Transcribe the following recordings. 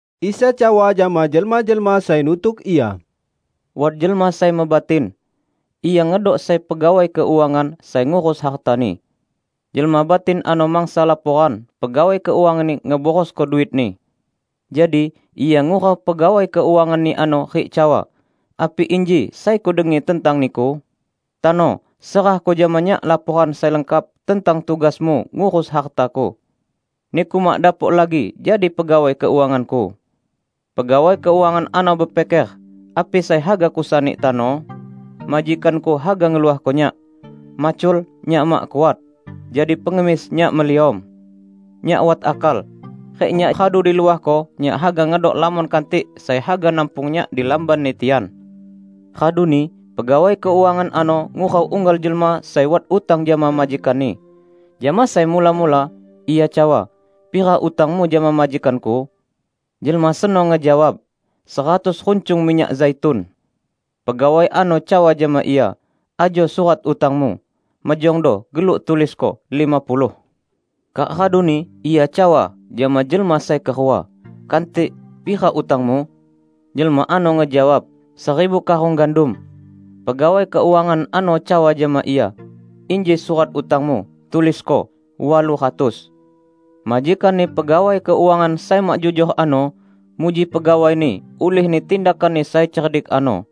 Isa cawa jama jelma-jelma sai nutuk Ia, "Wat jelma sai mebatin. Ia ngedok sai pegawai keuangan sai ngurus hartani. Jelma batin ano mangsa laporan pegawai keuanganni ngeborosko duitni. Jadi ia ngurau pegawai keuanganni ano rik cawa, 'Api inji sai kudengi tentang niku? Tano, serahko jama nyak laporan sai lengkap tentang tugasmu ngurus hartaku. Niku mak dapok lagi jadi pegawai keuanganku.' Pegawai keuangan ano bepiker, 'Api sai haga kusani tano? Majikanku haga ngeluahko nyak. Macul, nyak mak kuat; jadi pengemis, nyak meliom. Nyak wat akal; rik nyak radu diluahko, nyak haga ngedok lamon kantik sai haga nampung nyak di lambanni tian!' Raduni pegawai keuangan ano ngurau unggal jelma sai wat utang jama majikanni. Jama sai mula-mula, ia cawa, 'Pira utangmu jama majikanku?' Jelma seno ngejawab, 'Seratus runcung minyak zaitun.' Pegawai ano cawa jama ia, 'Ajo surat utangmu. Mejongdo geluk tulisko: lima puluh.' Kak raduni ia cawa jama jelma sai kerua, 'Kantik, pira utangmu?' Jelma ano ngejawab, 'Seribu karung gandum.' Pegawai keuangan ano cawa jama ia, 'Inji surat utangmu. Tulisko: walu ratus.' Majikanni pegawai keuangan sai mak jujor ano muji pegawaini ulihni tindakanni sai cerdik ano;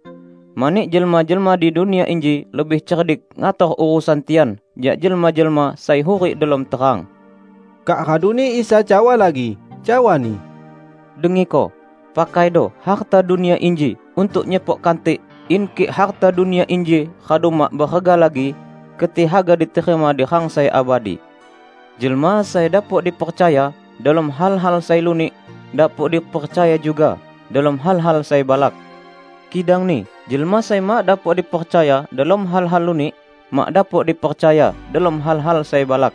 mani jelma-jelma di dunia inji lebih cerdik ngator urusan tian jak jelma-jelma sai hurik delom terang." Kak raduni Isa cawa lagi, cawa-Ni, "Dengiko! Pakaido harta dunia inji untuk nyepok kantik in kik harta dunia inji radu mak berega lagi, keti haga diterima di rang sai abadi. Jelma sai dapok dipercaya delom hal-hal sai lunik, dapok dipercaya juga delom hal-hal sai balak. Kidangni jelma sai mak dapok dipercaya delom hal lunik, mak dapok dipercaya delom hal-hal sai balak.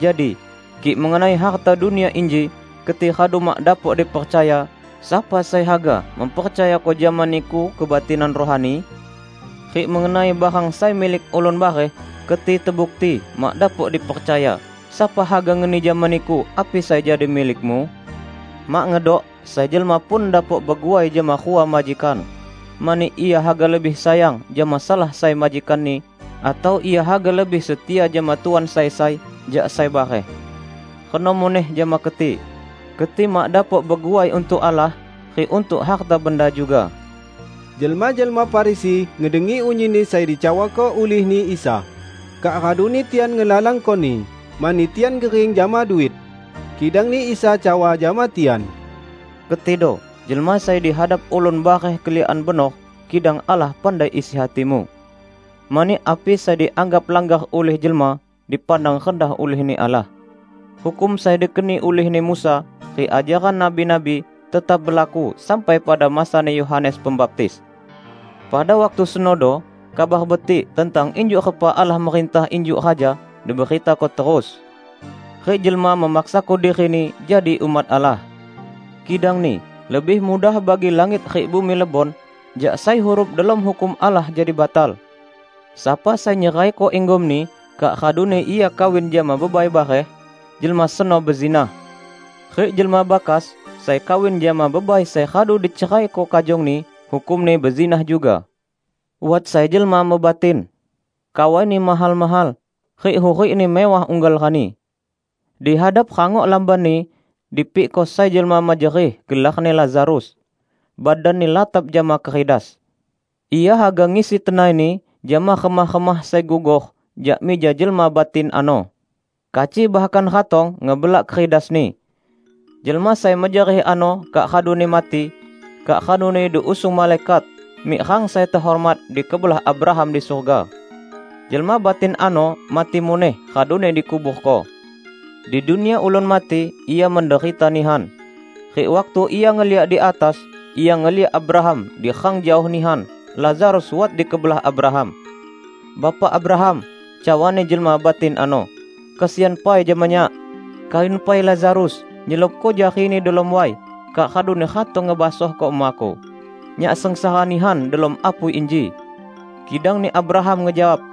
Jadi, kik mengenai harta dunia inji keti radu mak dapok dipercaya, sapa sai haga mempercayako jama niku kebatinan rohani? Rik mengenai barang sai milik ulun bareh, keti tebukti mak dapok dipercaya, sapa haga ngeni jama niku api sai jadi milikmu? Mak ngedok sai jelma pun dapok beguai jama rua majikan; mani ia haga lebih sayang jama salah sai majikanni, atau ia haga lebih setia jama tuan sai sai jak sai bareh. Reno muneh jama keti. Keti mak dapok beguai untuk Allah rik untuk harta benda juga." Jelma-jelma Farisi ngedengi unyinni sai dicawako ulihni Isa. Kak raduni tian ngelalangko-Ni, mani tian gering jama duit. Kidangni Isa cawa jama tian, "Ketido jelma sai di hadap ulun bareh keliakan benor, kidang Allah pandai isi hatimu. Mani api sai dianggap langgar ulih jelma, dipandang rendah ulihni Allah. Hukum sai dikeni ulihni Musa rik ajaran nabi-nabi, tetap belaku sampai pada masani Yohanes Pembaptis. Pada waktu senodo Kabar Betik tentang injuk repa Allah merintah injuk Raja diberitako terus. Rik jelma memaksako dirini jadi umat Allah. Kidangni lebih mudah bagi langit rik bumi lebon, jak sai huruf delom Hukum Allah jadi batal. Sapa sai nyeraiko inggomni kak raduni ia kawin jama bebai bareh, jelma seno bezinah. Rik jelma bakas sai kawin jama bebai sai radu diceraiko kajongni, hukumni bezinah juga." "Wat sai jelma mebatin. Kawaini mahal-mahal, rik hurikni mewah unggal rani. Di hadap rangok lambanni dipikko sai jelma mejerih gelarni Lazarus. Badanni latap jama keridas. Ia haga ngisi tenaini jama remah-remah sai gugor jak mija jelma batin ano. Kaci bahkan ratong ngebelak keridasni. Jelma sai mejerih ano kak raduni mati, kak raduni diusung malaikat mik rang sai tehormat di kebelah Abraham di surga. Jelma batin ano mati muneh raduni dikuborko. Di dunia ulun mati ia menderita nihan. Rik waktu ia ngeliak di atas, ia ngeliak Abraham di rang jaoh nihan, Lazarus wat di kebelah Abraham. 'Bapak Abraham!' cawani jelma batin ano. 'Kesian pai jama nyak. Kayun pai Lazarus nyelupko jarini delom way kak raduni ratong ngebasohko emaku. Nyak sengsara nihan delom apui inji!' Kidangni Abraham ngejawab,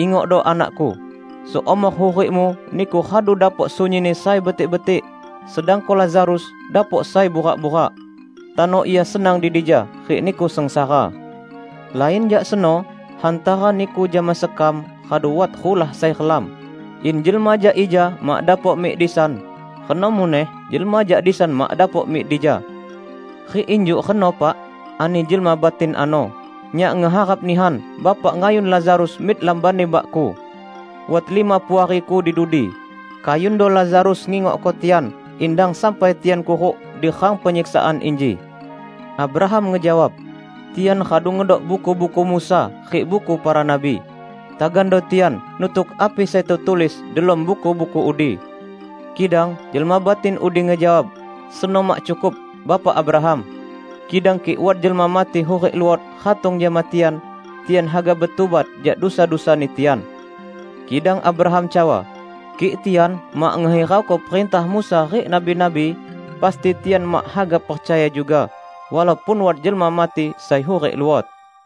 'Ingokdo anakku: seumor hurikmu niku radu dapok sunyinni sai betik-betik, sedangko Lazarus dapok sai burak-burak. Tano ia senang di dija, rik niku sengsara. Lain jak seno, hantara niku jama sekam radu wat rulah sai relam, in jelma jak ija mak dapok mik di san, reno muneh jelma jak disan mak dapok mik dija!' 'Rik injuk reno, Pak,' ani jelma batin ano, 'nyak ngeharap nihan Bapak ngayun Lazarus mik lambanni bakku. Wat lima puariku di dudi. Kayundo Lazarus ngingokko tian, in dang sampai tian kuruk di rang penyiksaan inji.' Abraham ngejawab, 'Tian radu ngedok buku-buku Musa rik buku para nabi! Tagando tian nutuk api sai tetulis delom buku-buku udi!' Kidang jelma batin udi ngejawab, 'Seno mak cukup, Bapak Abraham. Kidang kik wat jelma mati hurik luot ratong jama tian, tian haga betubat jak dusa-dusani tian.' Kidang Abraham cawa, 'Kik tian mak ngehirauko perintah Musa rik nabi-nabi, pasti tian mak haga percaya juga, walaupun wat jelma mati sai hurik luot.' "